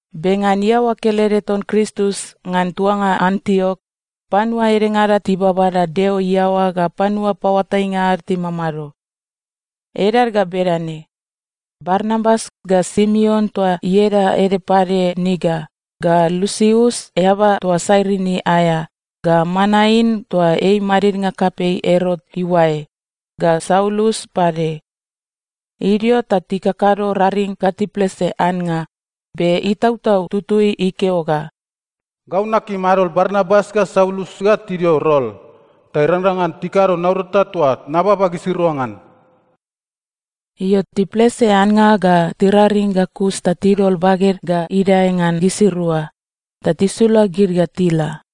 Be ngan iaoa kelede ton Kristus ngan tuanga Antiok, panua edengada tibabada Deo iaoa ga panua paoatainga ad timamado. Edad ga bedane: Barnabas, ga Simeon toa ieda ede pade Niger, ga Lusius eaba toa Sairini aea, ga Manain toa ei madidnga kapei Erot iuae, ga Saulus pade. Idio ta tikakado raring ga tiplese annga, be Itautau Tutui ikeo ga, “Gau nakim gimi adol Barnabas ga Saulus ga tidio rol, ta irangrang ngan tikado naurata toa nababa gisirua ngan.” Io, tiplese annga ga tiraring ga kus ta tidol baged ga idae ngan gisirua, ta tisula gid ga tila.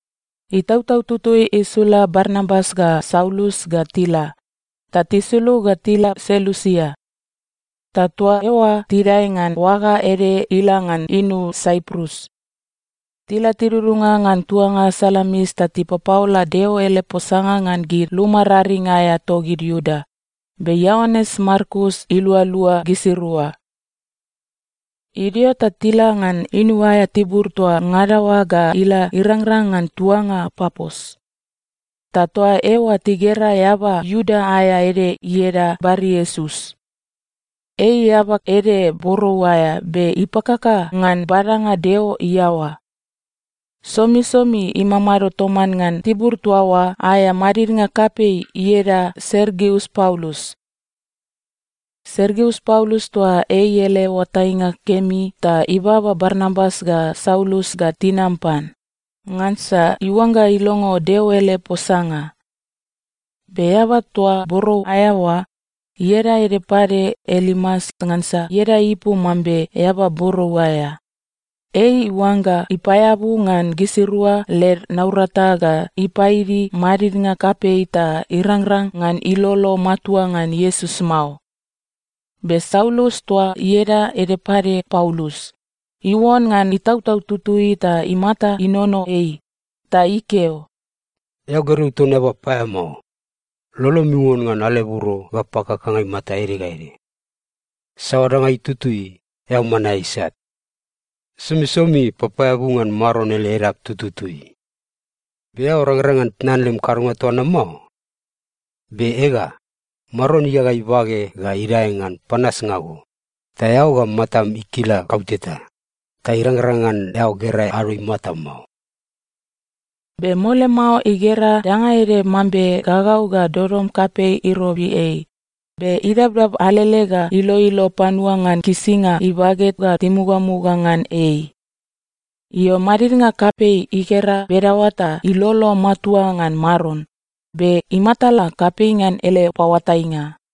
Itautau Tutui isula Barnabas ga Saulus ga tila, ta tisulug ga tila Selusia. Ta toa eoa tidae ngan oaga ede ila ngan inu Saiprus. Tila tidudunga ngan tuanga Salamis ta tipapaola Deo ele posanga ngan gid luma raring aea togid Iuda, be Ioanes Markus ilualua gisirua. Idio ta tila ngan inu aea tibur toa ngada oa ga ila irangrang ngan tuanga Papos. Ta toa eoa tigera eaba Iuda aea ede ieda Bariesus. Ei eaba ede borou aea be ipakaka ngan badanga Deo iaoa. Somisomi imamado toman ngan tibur toa oa aea madidnga kapei ieda Sergius Paulus. Sergius Paulus toa ei ele oatainga kemi ta ibaba Barnabas ga Saulus ga tinam pan, ngansa iuangga ilongo Deo ele posanga. Be eaba toa borou aea oa (ieda ede pade Elimas ngansa ieda ipu mambe Eaba Borou aea), ei iuangga ipaeabu ngan gisirua led naurata ga ipaidi madidnga kapei ta irangrang ngan ilolo matua ngan Iesus mao. Be Saulus toa ieda ede pade Paulus, iuon ngan Itautau Tutui ta imata inono ei ta ikeo, “Eao gergeu ton eaba paeamao! Lolom iuon ngan aleburo ga pakakanga imata ede ga ede. Saoa danga itutui, eao man aea isat. Somisomi papaeabu ngan Maron ele edap tututui. Be eao rangrang ngan tnan lem kadonga toa na mao? Be ega, Maron igaga ibage ga idae ngan panasnga go, ta eao ga matam ikila kauteta, ta irangrang ngan eao gera ado imata mao.” Be mole mao igera danga ede mambe gagau ga dodom kapei irobi ei, be idabdab alele ga iloilo panua ngan kisinga ibage ga timugamuga ngan ei. Io, madidnga kapei igera bedaoa ta ilolo matua ngan Maron, be imatala kapei ngan ele paoatainga.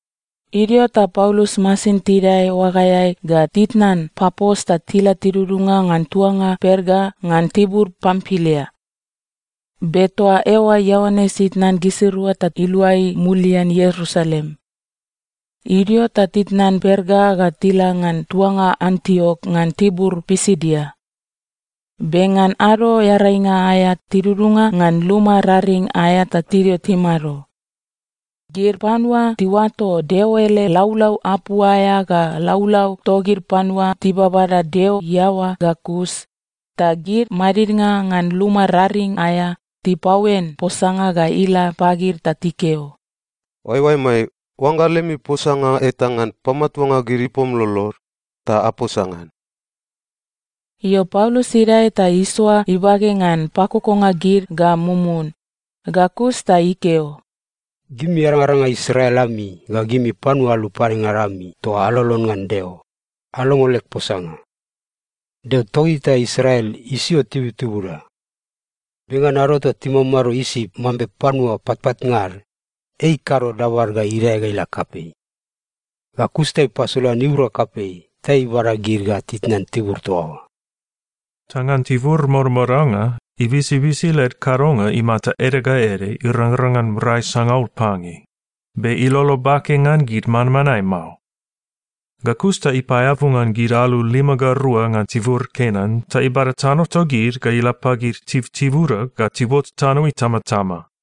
Idio ta Paulus masin tidae oagaeai ga titnan Papos ta tila tidudunga ngan tuanga Perga ngan tibur Pampilia. Be toa eoa Ioanes itnan gisirua ta iluai mulian Ierusalem. Idio ta titnan Perga ga tila ngan tuanga Antiok ngan tibur Pisidia. Be ngan Ado Earainga aea tidudunga ngan luma raring aea ta tidio timado. Gid panua tiuato Deo ele laulau apu aea ga laulau togid panua tibabada Deo iaoa ga kus, ta gid madidnga ngan luma raring aea tipaoen posanga ga ila pagid ta tikeo, “Oaeoaemai, oangga lemi posanga eta ngan pamatuanga gid ipom lolod, ta aposa ngan.” Io, Paulus idae ta isoa ibage ngan pakokonga gid ga mumun, ga kus ta ikeo, “Gimi arangaranga Israel ami ga gimi panua alu padengada ami toa alolon ngan Deo, alongo leg posanga. Deo togita Israel isio tibutibuda. Be ngan ado toa timamado Isip mambe panua patpatnga ad, ei ikado dabad ga idae ga ila kapei. Ga kus ta ipasolan iura kapei ta ibada gid ga titnan tibur toa oa. Ta ngan tibur modamodanga, ibisibisi led kadonga imata ede ga ede irangrang ngan rai sangaul pange, be ilolo bake ngan gid manmanae mao. Ga kus ta ipaeabu ngan gid alu lima ga rua ngan tibur Kenan ta ibada tano togid ga ila pagid tibutibuda ga tiuot tano itamatama.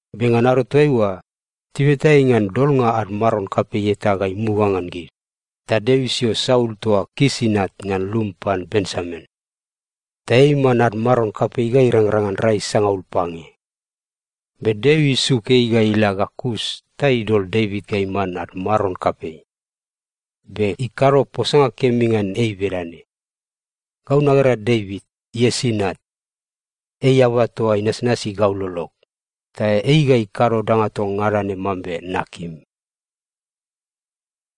Be ngan ado toaiua, tibeta ei ngan dolnga ad maron kapei eta ga imuga ngan gid, ta Deo isio Saul toa Kis inat ngan lum pan Benjamin. Ta ei iman ad maron kapei ga irangrang ngan rai sangaul pange. Be Deo isuk ei ga ila ga kus ta idol Devit ga iman ad maron kapei. Be ikado posanga kemi ngan ei bedane, ‘Gau nagera Devit, Iesi inat, ei eaba toa inasnasi gau lolog. Ta ei ga ikado danga toa ngada ne mambe nakim.’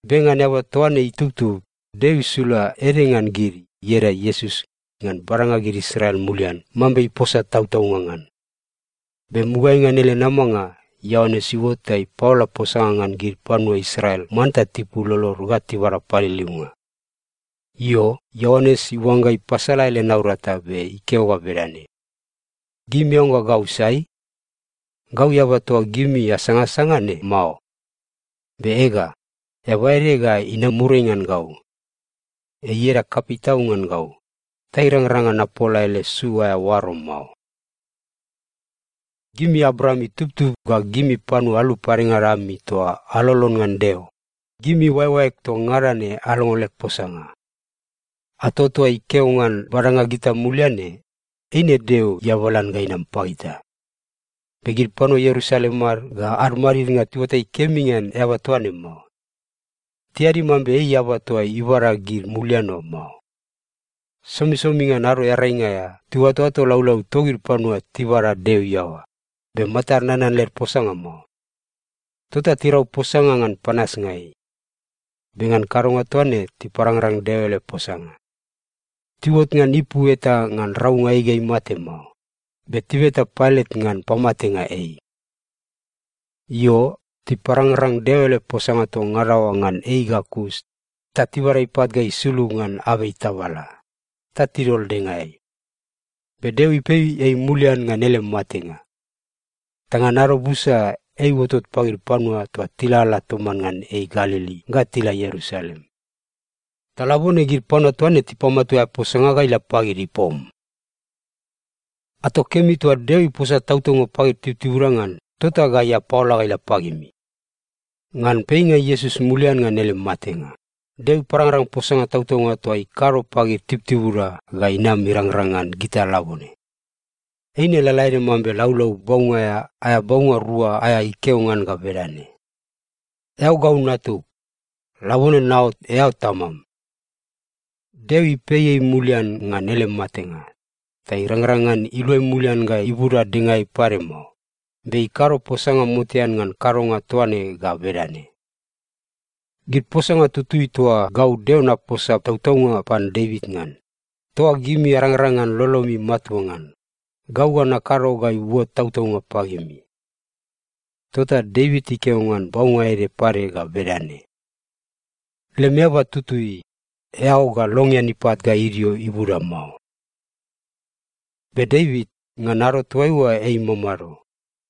“Be ngan eaba toa ne itubtub, Deo isula ede ngan gid, ieda Iesus, ngan badanga gid Israel mulian mambe iposa tautaunga ngan. Be mugaeai ngan ele namanga, Ioanes iuot ta ipaola posanga ngan gid panua Israel manta tipul lolod ga tibada paliliunga. Io, Ioanes iuangga ipasala ele naurata be ikeo ga bedane, ‘Gimi aoangga gau sai? Gau eaba toa gimi asangasanga ne mao. Be ega, eaba ede ga inam muriai ngan gau. Ei ieda kapei tau ngan gau, ta irangrang ngan napola ele su aea oaro mao.’ “Gimi Abraam itubtub ga gimi panua alu padengada ami toa alolon ngan Deo, gimi oaeoaeg toa ngada ne alongo leg posanga. Ato toa ikeo ngan badanga gita mulian ne, eine Deo iabalan ga inam pagita. Be gid panua Ierusalem ad ga ad madidnga tiuatai kemi ngan eaba toa ne mao. Tiadi mambe ei eaba toa ibada gid mulian oa mao. Somisomi ngan Ado Earainga aea, tiuatoato laulau togid panua tibada Deo iaoa, be matad nanan led posanga mao. Tota tirau posanga ngan panasnga ei. Be ngan kadonga toa ne tiparangrang Deo ele posanga. Tiuot ngan ipu eta ngan raunga ei ga imate mao, be tibeta Pailat ngan pamatenga ei. Io, tiparangrang Deo ele posanga toa ngada oa ngan ei ga kus ta tibada ipat ga isulug ngan abei tabala, ta tidol dengaeai. Be Deo ipei ei mulian ngan ele matenga. Ta ngan ado busa, ei iuotot pagid panua toa tilalala toman ngan ei Galili ga tila Ierusalem. Ta labone gid panua toa ne tipamatua aea posanga ga ila pagid ipom. “Ato kemi toa Deo iposa tautaunga pagid tibutibuda ngan, tota gai apaola ga ila pagimi. Ngan peinga Iesus mulian ngan ele matenga, Deo iparangrang posanga tautaunga toa ikado pagid tibutibuda ga inam irangrang ngan gita labone. Eine lalaede mambe Laulau Baunga aea, aea baunga rua aea ikeo ngan ga bedane, “‘Eao gau Natug. Labone naot eao Tamam.’ Deo ipei ei mulian ngan ele matenga, ta irangrang ngan iluai mulian ga ibuda dengaeai pade mao, be ikado posanga motean ngan kadonga toa ne ga bedane, “‘Gid posanga tutui toa gau Deo naposa tautaunga pan Devit ngan, toa gimi arangrang ngan lolomi matua ngan, gau ga nakado ga iuot tautaunga pagimi.’ Tota Devit ikeo ngan baunga ede pade ga bedane, “‘Lem Eaba Tutui, eao ga longean ipat ga idio ibuda mao.’ “Be Devit, ngan ado toaiua ei imamado,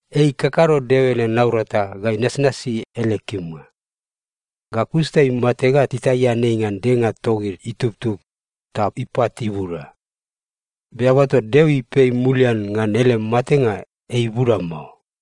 ei ikakado Deo ele naurata ga inasnasi ele kimnga. Ga kus ta imate ga titaian ei ngan denga togid itubtub, ta ipat ibuda. Be eaba toa Deo ipei mulian ngan ele matenga, ei ibuda mao.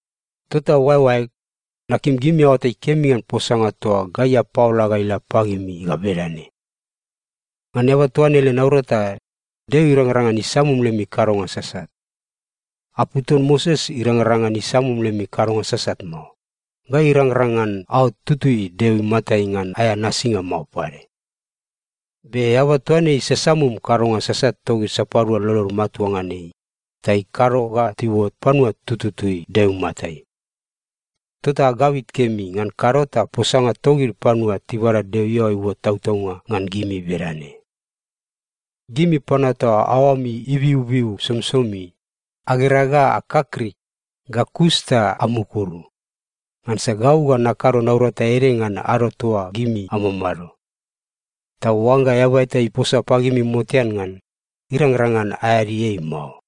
“Tota oaeoaeg, nakim gimi aoatai kemi ngan posanga toa gai apaola ga ila pagimi ga bedane: Ngan eaba toa ne ele naurata, Deo irangrang ngan isamum lemi kadonga sasat. Apu ton Moses irangrang ngan isamum lemi kadonga sasat mao, ga irangrang ngan aot tutui Deo imatai ngan aea nasinga mao pade. Be eaba toa ne isasamum kadonga sasat togid sapadua lolod matua ngan ei, ta ikado ga tiuot panua tututui Deo imatai. Tota agabit kemi, ngan kado ta posanga togid panua tibada Deo iaoa iuot tautaunga ngan gimi bedane, “‘Gimi panua toa aoami ibiubiu somisomi, agera ga akakrik, ga kus ta amukuru, ngansa gau ga nakado naurata ede ngan ado toa gimi amamado. Ta oangga eaba eta iposa pagimi motean ngan, irangrang ngan aeadi ei mao.’”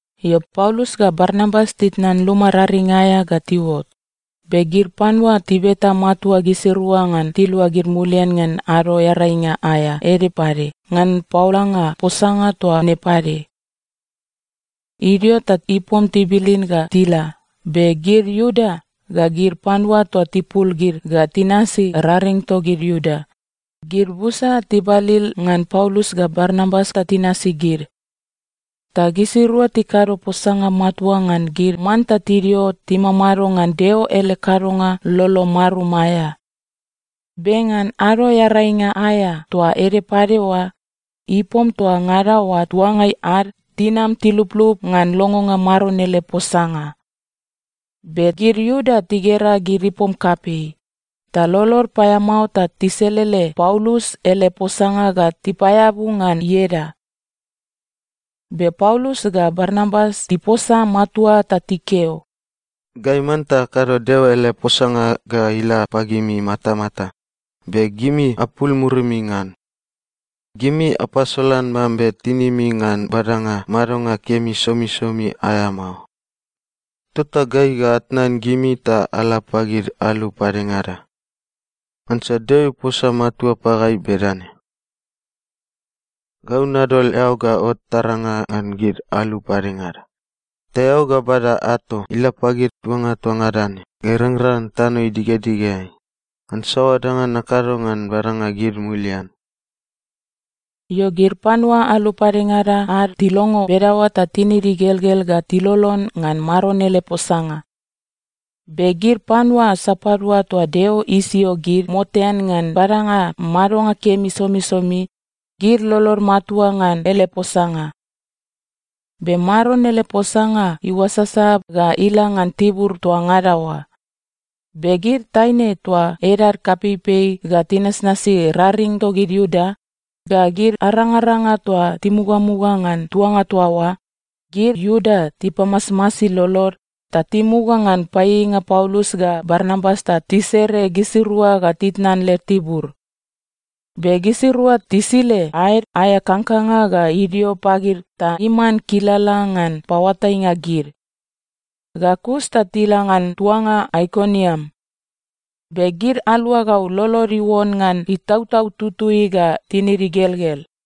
Io, Paulus ga Barnabas titnan luma raring aea ga tiuot, be gid panua tibeta matua gisirua ngan tiluagid mulian ngan Ado Earainga aea ede pade ngan paolanga posanga toa ne pade. Idio ta ipom tibilin ga tila, be gid Iuda ga gid panua toa tipul gid ga tinasi raring togid Iuda, gid busa tibalil ngan Paulus ga Barnabas ta tinasi gid. Ta gisirua tikado posanga matua ngan gid manta tidio timamado ngan Deo ele kadonga lolo marum aea. Be ngan Ado Earainga aea toa ede pade oa, ipom toa ngada oa tuangai ad tinam tiluplup ngan longonga Maron ele posanga. Be gid Iuda tigera gid ipom kapei, ta lolod paeamao ta tiselele Paulus ele posanga ga tipaeabu ngan ieda. Be Paulus ga Barnabas tiposa matua ta tikeo, “Gai manta akado Deo ele posanga ga ila pagimi matamata, be gimi apul murimi ngan. Gimi apasolan mambe tinimi ngan badanga madonga kemi somisomi aea mao. Tota gai ga atnan gimi ta ala pagid alu padengada. Ngansa Deo iposa matua pagai bedane, “‘Gau nadol eao ga ot taranga ngan gid alu padengada, ta eao ga bada ato ila pagid tuanga toa ngada ne ga irangrang ngan tano idigedigeai, ngan saoa danga nakado ngan badanga gid mulian.’” Io, gid panua alu padengada ad tilongo bedaoa ta tinid igelgel ga tilolon ngan Maron ele posanga. Be gid panua sapadua toa Deo isio gid motean ngan badanga madonga kemi somisomi, gid lolod matua ngan ele posanga. Be Maron ele posanga iuasasa ga ila ngan tibur toa ngada oa. Be gid taine toa edad kapeipei ga tinasnasi raring togid Iuda, ga gid arangaranga toa timugamuga ngan tuanga toa oa, gid Iuda tipamasmasi lolod, ta timuga ngan paieieinga Paulus ga Barnabas ta tisere gisirua ga titnan led tibur. Be gisirua tisile aed aea kangkanga ga idio pagid ta iman kilala ngan paoatainga gid. Ga kus ta tila ngan tuanga Aikoniam. Be gid aluagau lolod iuon ngan Itautau Tutui ga tinid igelgel.